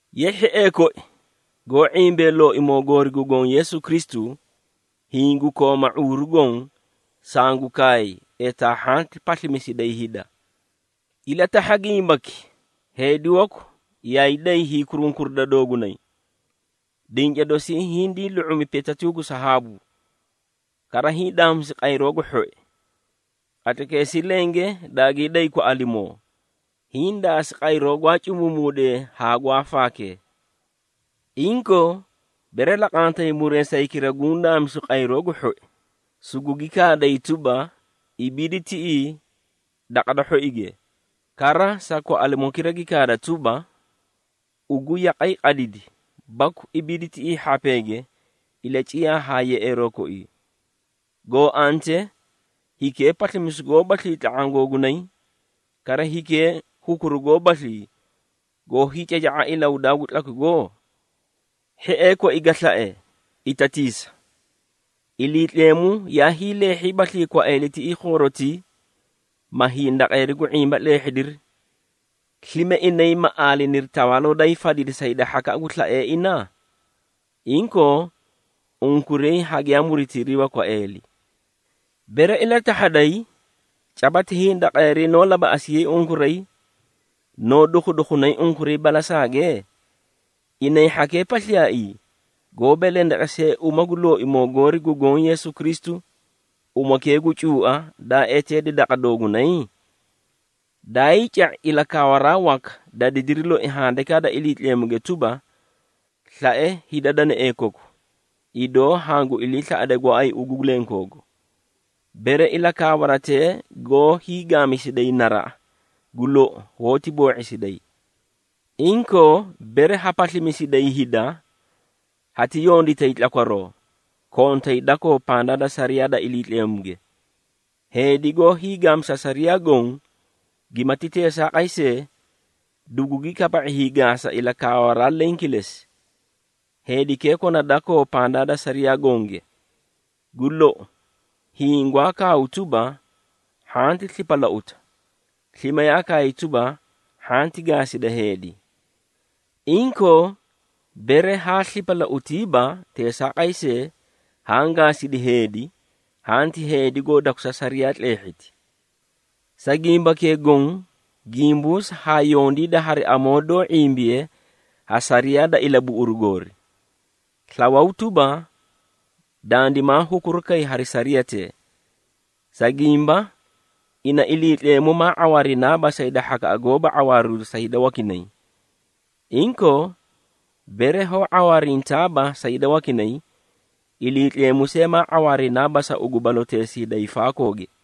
Ye hhiee koi, goó ⁄imbee Looimoo goori gu Goõ Yeesu Kristu, hiĩ gu kooma ⁄uuru goõ, sangu kaay, etaa hhanti paslimisiday hida. Ilatahha gimbaki: heedi waku yaay day hiikurunkurida doogunay, dinca dosii hindii lu⁄umi petee gu sahaabu, kara hiĩ daamisi qayroo gu hhoi. Qatlaykeesii lenge daagii day kwaꞌalimoo, hiĩ daasi qayroo gwaa cumuumuudee haa gwaa faakee. Inkoo, bere laqantay muree sa hikira guũ daamisu qayroo gu hhoi, sugugi kaaday tuba, “Ibiidi tiꞌii daqa da hhoige,” kara sa kwaꞌalimokira gi kaaday tuba, “Ugu yaqay qadidi,” baku “Ibiidi tiꞌii hhapeege, ilaciyaa haa yeꞌeeroo koii,” goo antee, hikee paslimisu goobaslii tla⁄aã googunay, kara hikee hukuru goobaslii, goó hiicaca⁄a ilahudaa gu tlakwigo? Hhiee koi ga slae, itatiisa! Iliitleemu yaa hiileehhiibaslii kwaeeli tiꞌii khoorotii, ma hindaqeeri gu ⁄imba tleehhidiri. Slime, inay ma aaliniri tawaaloo daa hiifadidi sa hida hhakaꞌa gu slaee ina? Inkoo, unkuray hagiyaa muritiriiba kwaeeli. Bere ilatahhaday, caba ti hindaqeeri noó labaꞌasiyay unkuray, noó dukhudukhunay unkuray balasaage? Inay hhakee pasliyaaii, goó belendeqesee uma gu Looimoo goori gu Goõ Yeesu Kristu, umakee gu cuua, daa eteedi daqa doogunay? Daayii ca⁄i ilakaawaraa waka, da didiri loi Handikaa da Iliitleemuge tuba, “Slae hida danaee koku, idoo hangu iliislaꞌade gooay ugu lenkoogu.” Bere ilakaawaratee goó hiigaamisiday naraꞌa, gu lou, hoóti boo⁄isiday. Inkoo, bere ha paslimisiday hida, hati yonditay tlakwaroo, kontay dakoo pandaa da sariyaa da Iliitleemuge. Heedi goó hiigaamisa sariyaa goõ, gimati teesaaqay see, dugugi kaba⁄i hiigaasa ilakaawaraa leẽ kilesi, heedikee kona dakoo pandaa da sariyaa gonge. Gu lou, hiĩ gwaa kaaw tuba, “Hhanti slipalauta,” slime yaa kaay tuba, “Hhanti gaasida heedi.” Inkoo, bere haa slipalautiiba, teesaaqay see, haã gaasidi heedi, hanti heedi goo dakusa sariyaa tleehhiti. Sa gimbakee goõ, gimbuusa haa yondiida hari amoo doó ⁄imbiye ha sariyaa da ilabuꞌuru goori. Slawaw tuba, dandimaa hukuru kay hari sariyatee. Sa gimba, ina Iliitleemu maa ⁄awaarinaaba sa hida hhakaꞌa goóba ⁄awaariru sa hida wakinay. Inkoo, bere hoó ⁄awaarintaaba sa hida wakinay, Iliitleemu see maa ⁄awaarinaaba sa ugu baloteesii da hiifaakooge.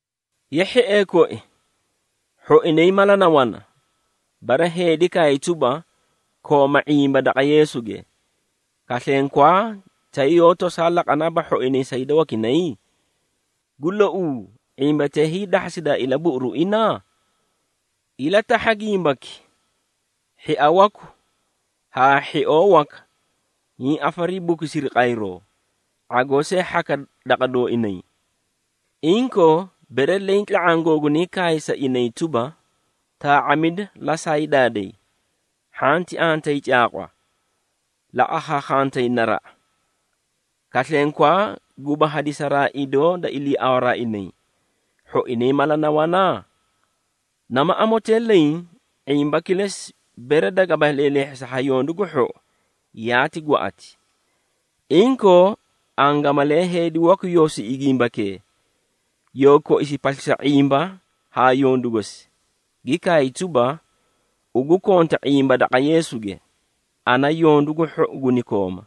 Ye hhiee koi, hhoinay mala na wana, bere heedi kaay tuba, “Kooma ⁄imba daqa Yeesuge,” kaslenkwaa, tay yoó tosaa laqanaaba hhoinay sa hida wakinay? Gu louu, ⁄imbatee hiidahhasidaa ilabuꞌuruu ina? Ilatahha gimbaki: hhia waku haa hhioo waka hiĩ afariibukusiri qayroo, ⁄agoo see hhaka daqa dooinay. Inkoo, bere leẽ tla⁄aã googunay kaay sa inay tuba, “Taa⁄amida, la saayu daaday, hhanti antayi caaqwa, la akhaakhantayi naraꞌa,” kaslenkwaa, guba hadisaraa idoo da iliiawaraa inay, hhoinay mala na wana? Nama amotee leẽ, ⁄imba kilesi, bere dagaba leelehhisa ha yondu gu hhou, yaati gwaꞌati. Inkoo, angamalee heedi waku yoo siꞌi gimbakee, yoo koisi paslisa ⁄imba haa yondu gosi, gi kaay tuba, “Ugu konta ⁄imba daqa Yeesuge, ana yondu gu hhou guni kooma.”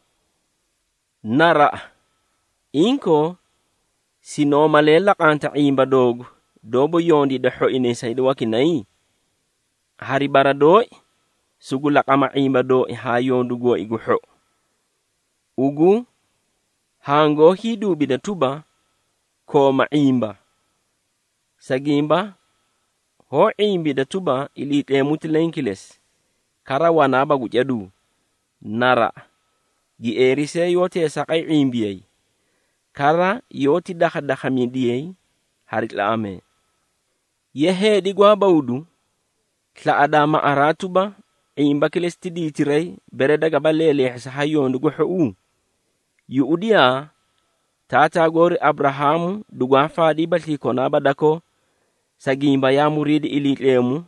Naraꞌa! Inkoo, sinoo malee laqanta ⁄imba doogu doóba yondiida hhoinay sa hida wakinay? Hari bara dooi, sugu laqama ⁄imba dooi hari yondu gooi gu hhou. Ugu hangoó hiiduubida tuba, “Kooma ⁄imba,” sa gimba hoó ⁄imbida tuba, Iliitleemu ti leẽ kilesi, kara wanaaba gu caduu. Naraꞌa! Gieeri see yoó teesaaqay ⁄imbiyay, kara yoóti dakhadakhamidiyay hari tlaꞌamee. Ye, heedi gwaa bawdu, slaꞌadaa maꞌaraa tuba, ⁄imba kilesi ti diitiray, bere dagaba leeleehhisa ha yondu gu hhouu? Yuꞌudiyaa, taataa goori Aburahaamu dugwaa faadiibaslii konaaba dakoo, sa gimba yaa muriidi Iliitleemu,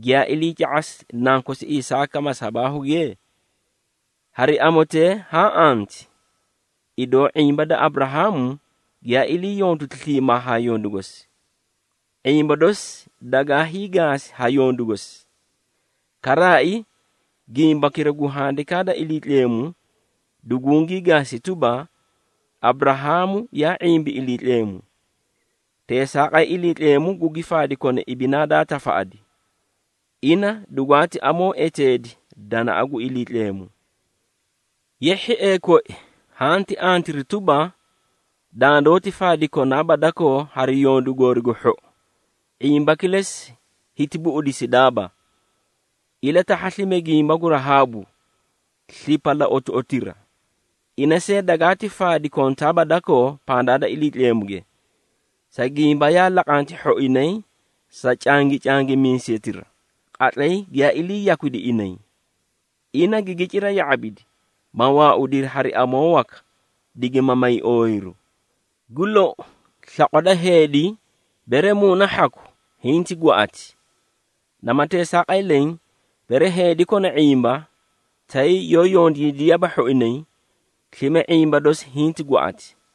giyaa iliica⁄asi nankosi Isaaka masabaahuge? Hari amotee haã anti, idoo ⁄imba da Aburahaamu giyaa ilii yonditi sliimaa haa yondu gosi. ⁄imba dosi dagaa hiigaasi ha yondu gosi. Karaai, gimbakira gu Handikaa da Iliitleemu dugugii gaasi tuba, “Aburahaamu yaa ⁄imbi Iliitleemu, teesaaqay Iliitleemu gugi faadi kona ibinaa daa tafaꞌadi.” Ina dugwaati amoo eteedi danaꞌa gu Iliitleemu. Ye hhiee koi, hanti antiri tuba, dandoóti faadi konaaba dakoo hari yondu goori gu hhou, ⁄imba kilesi hiti buꞌudisidaaba. Ilatahha slime gimba gu Rahaabu, slipalauutoꞌotira. Ina see dagaati faadi kontaaba dakoo pandaa da Iliitleemuge, sa gimba yaa laqanti hhoinay sa cangicangimiisetira, qatlay giyaa ilii yakwidi inay. Ina gigi cira ya⁄abidi, ma waaudiri hari amoo waka, digima may ooyiru. Gu lou, slaqwa da heedi, bere muuna hhaku, hinti gwaꞌati. Nama teesaaqay leẽ, bere heedi kona ⁄imba, tay yoó yondiidiyaaba hhoinay, slime ⁄imba dosi hinti gwaꞌati.